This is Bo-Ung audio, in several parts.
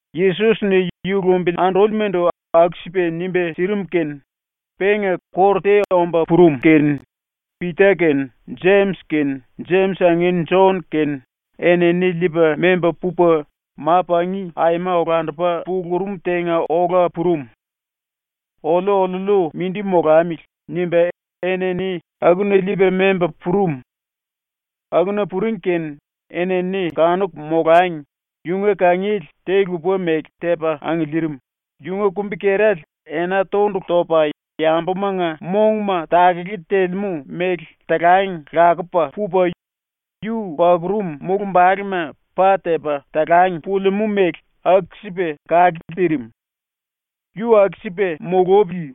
Yesos-ni ⸤yu lumbili andúlimandu aku-sipa nimba sirim kene⸥ penga kóru te omba purum kene Pita kene Jemis kene Jemis angin Jon kene enini liipa memba pupa ma-pangi aima olandupa pulurum tenga ola purum. ‘Oliu oliuliu mindi molamili.’ nimba enini akuna liipa memba purum. Akuna puring kene enini kanuku molangi yunga kangiele te-lupa-mele tepa angiliirim, yunga kumbi-kerale ena tondulu topa yambumanga mongma takele telemú mele talang lakupa pupa, yu pakurum mulumbalema pa tepa talang pulimú mele aku-sipa kake tirim. Yu aku-sipa mulupili,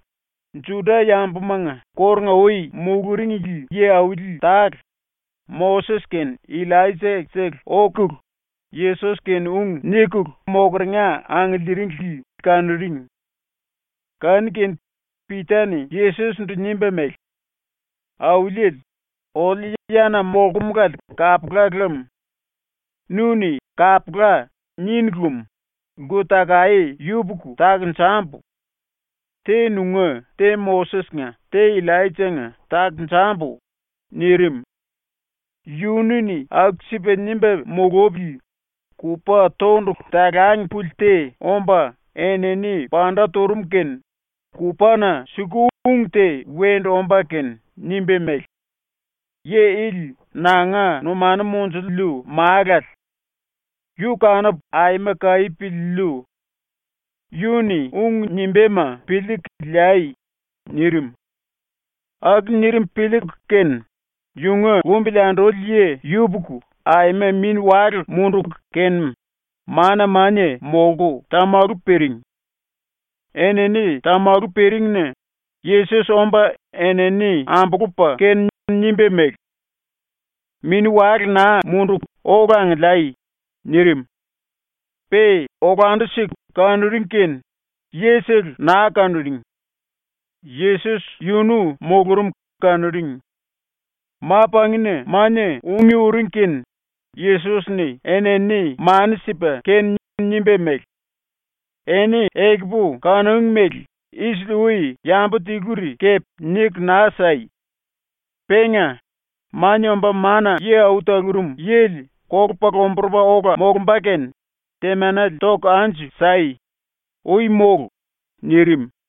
⸤Juda-yambumanga kórunga-ui muluringli yi-auli tale,⸥ Moses kene Illaija-sele okulu Yesos-kene ung nikulu mokeringa angiliiringli kanuring. Kanu-kene Pita-ni Yesos-ndu nimba mele: “Auliele, oliu yana molkumulale kapula lam. Nu-ni “Kapula.” ninu lem, lku-takaé yupuku takonjambu. Te nunga, te Moses-nga, te Illaija-nga takonjambu.” nirim. Yunu-ni aku-sipa nimba mulupili kupa tondulu talang puli te omba enini panda turum kene kupana suku ung te wendu omba kene nimba mele: “Yi ili nanga numanu monjuliu Málale. Yu kanupu aima kaí piliiliu. Yu-ni ung nimbáma piliiku liai.” nirim. Aku nirim piliiku kene yunga lumbili anduli yi ⸤yupuku⸥ aima mini-wale munduku kene mana-mania molku tamalu piring. Enini tamalu piringna Yesos omba enini ambulupa kene nimba mele: “Mini-wale naa munduku ola angiliai.” nirim. Pe olandu-siku kanuring kene yisele naa kanuring. Yesos yunu mulurum kanuring. Ma-pangina mania ungí uring kene Yesos-ni enini mani sipa kene nimba mele: “Eni ekupu kanúngi mele isili-ui yambu tiluri kepe niku naa sai. Penga, Mania Omba Mana-Yi Au Talurum Yili kolupa lomburupa ola molumba kene temanele toku anju sai. Ui mólu!” nirim.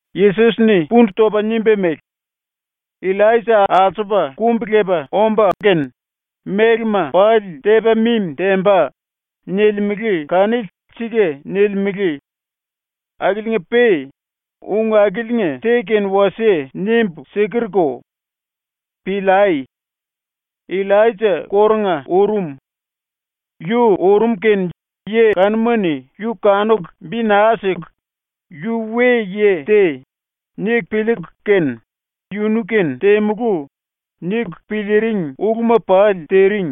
Yesos-ni pundu topa nimba mele: “ “Illaija ⸤alsupa⸥ kumbi-lepa omba kene mélema pali tepa mimi temba.” nilimele kanili sika nilimele. Akiliinga-pe ⸤ung akiliinga te kene wasie nimbu sikerko.⸥ Piliai. Illaija kórunga urum. Yu urum kene ⸤yi kanuma-ni⸥ yu kanuku bi naa siku ‘Yu we-yi te.’ niku piliiku kene ‘Yunu-kene temulú.’ niku piliiring uluma pali tiring.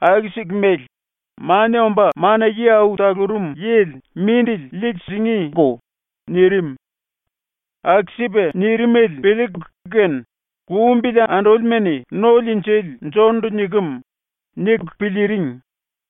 Aku-siku mele Mania Omba Mana-Yi Au Talurum Yili mindili liiku singíko.” nirim. Aku-sipa nirimele piliiku kene lumbili andúlima-ni ‘No-Liinjili Jon-ndu nikem.’ niku piliiring.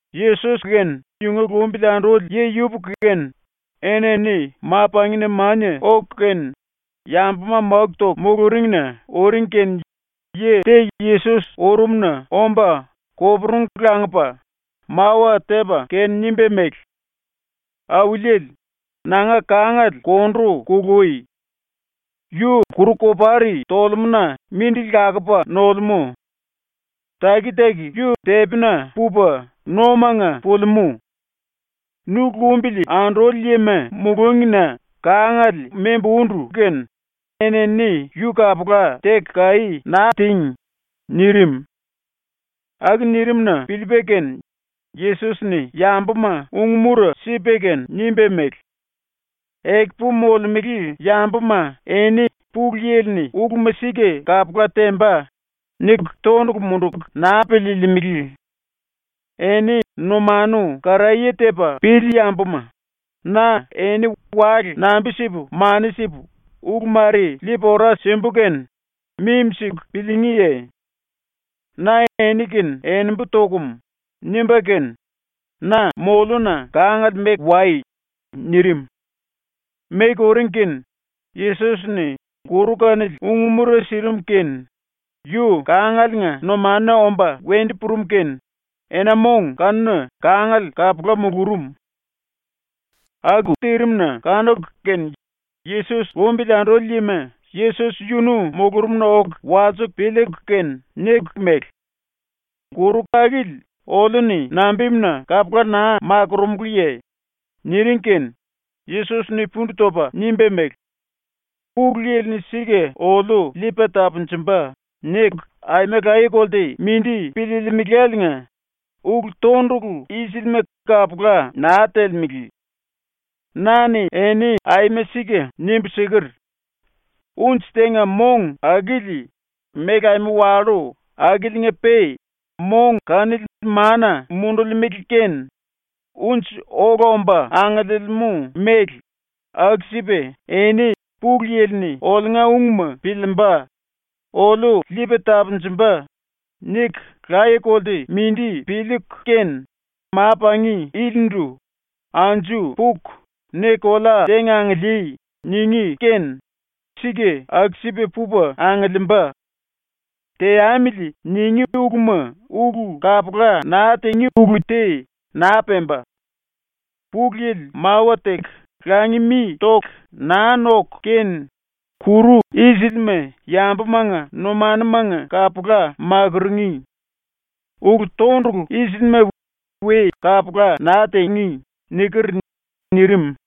⸤Yesos kene yunga lumbili anduli yi yupuku kene⸥ enini ⸤ma-pangina mania⸥ oku kene yambuma máku toku muluringna uring kene yi te Yesos urumna omba koporungu langupa mawa tepa kene nimba mele: “Auliele, nanga kangale kondu kului. Yu kuru-kopari tolemú-na mindili lakupa nolemú. Taki-taki yu tepina pupa nomanga pulimú. Nu lumbili anduli yima mulúngina kangale membu úndu kene enini yu kapula teku kaí naa tíngi.” nirim. Aku nirim-na piliipa kene Yesos-ni ⸤yambuma ung-mura sipa kene⸥ nimba mele: “Ekupu molemele yambuma eni ⸤‘Pulu Yili-ni uluma sika kapula temba.’ niku⸥ tondulu munduku naa piliilimili. Eni numanu karaye tepa pili yambuma, na eni wale nambi-sipu mani sipu ulu mare liipu ora simbu kene mimi-siku piliingíye? ⸤Na eni-kene enembu tokum.⸥” nimba kene “Na moliuna kangale meku wai.” nirim. Meku uring kene Yesos-ni kuru kanili ung-mura sirim kene yu kángalenga ⸤numanuna⸥ omba wendu purum kene ena-mong kanuna kángale kapula mulurum. Aku tirim-na kanuku kene Yesos lumbili anduli yima Yesos yunu mulurumna oku walsiku piliiku kene niku mele: “Kuru akili oliu-ni nambimuna kapula naa makurúmuluye?” niring kene Yesos-ni pundu topa nimba mele: “ ⸤‘ulu Yili-ni sika oliu liipa tapunjumba.’ niku⸥ aima laye-kolte mindi piliilimiléliinga ulu-tondulu i-silima kapula naa telemele. Na-ni eni aima sika nimbu siker: “Unji tenga mong akili méle aima wallú akiliinga-pe mong kanili mana mundulimele kene unji ola omba angiliimú mele, aku-sipa eni ‘Pulu Yili-ni oliunga ungma piliimba. Oliu liipa tapunjumba.’ niku laye-kolte mindi piliiku kene ma-pangi ilindu “Anju puku ne kolea tenga angilíí.” ningí kene sika aku-sipa pupa angiliimba. ‘Teamili.’ ningí uluma ulu kapula naa tingí ulu te naa pemba. (Pulu Yili mawa teku langi mi toku naa noku kene kuru i-silima yambumanga numanumanga kapula makurungí. Ulu-tondulu i-silima we kapula naa tingí.)” niker.” nirim.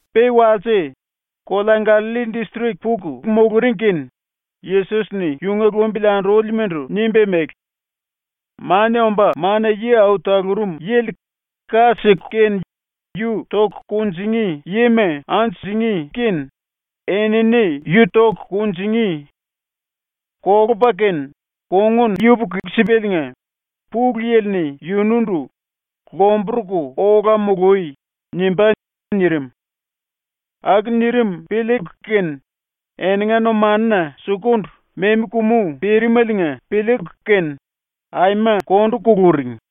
⸤Pe walse,⸥ kolea Gallalli distrik puku muluring kene Yesos-ni yunga lumbili andúlimandu nimba mele: “Mania Omba Mana-Yi Au Talurum Yili ⸤ka siku kene yu toku kunjingí⸥ yima anju singí kene enini yu toku kunjingí. Kolupa kene kongun yupuku-sipaliinga Pulu Yili-ni yunundu ‘Lomburuku ola mului.’ nimbá.” nirim. Aku nirim piliiku kene eninga numanuna sukundu memi kumu pirimeliinga piliiku kene aima kondu kuluring.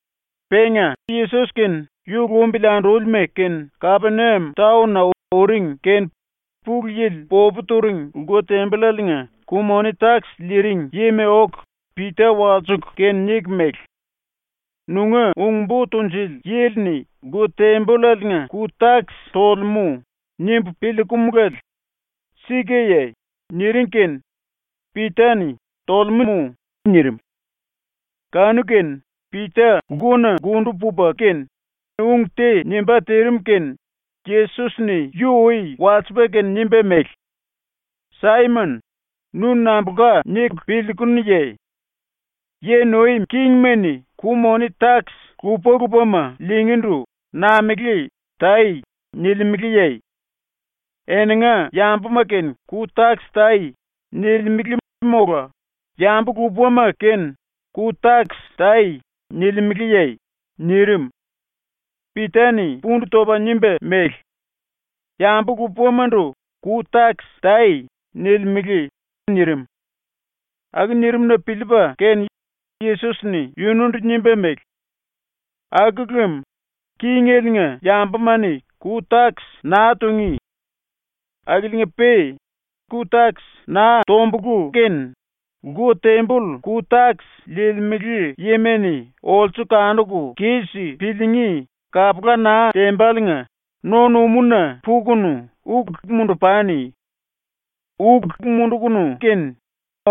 Penga Yesos kene yu lumbili andúlima kene Kapeniam taon-na uring kene Pulu Yili popu turing lku-tembollaliinga ku-moni-takis liiring yima oku Pita walsiku kene niku mele: “‘Nunga ung-bo tunjuli yili-ni lku-tembollaliinga ku-takis tolemú.’ nimbu piliikumulale. Sikaye?” niring kene Pita-ni “Tolemú.” nirim. Kanu-kene Pita lkuna lkundu pupa kene ung te nimbá tirim kene Yesos-ni yu ui walsipa kene nimba mele: “Saimon, nu nambulka niku piliikunuye? Yi nuim kingima-ni ku-moni-takis lupa-lupama liingíndu namelé “Tai.” nilimeleye? “Eninga yambuma kene ku-takis tai.” nilimele mola “Yambu-lupama kene ku-takis tai.” nilimeleye?” nirim. Pita-ni pundu topa nimba mele: “Yambu-lupamandu ‘Ku-takis tai.’ nilimele.” nirim. Aku nirim-na piliipa kene Yesos-ni yunundu nimba mele: “Aku lem kingeliinga yambuma-ni ku-takis naa tungí. Akiliinga-pe ku-takis naa tombulú kene lku-temboll ku-takis liilimele yima-ni olsu kanuku kis piliingí kapula naa tembaliinga no-numúna pukunu uk mundu-pani. Uk mundukunu kene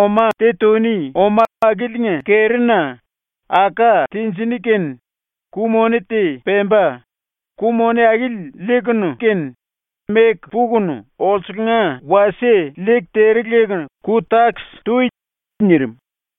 oma te tuni oma akiliinga kerina aká tinjiní kene ku-moni te pemba, ku-moni akili liikunu kene meku pukunu olsunga wasie liiku tere leku ku-takis tui.” nirim.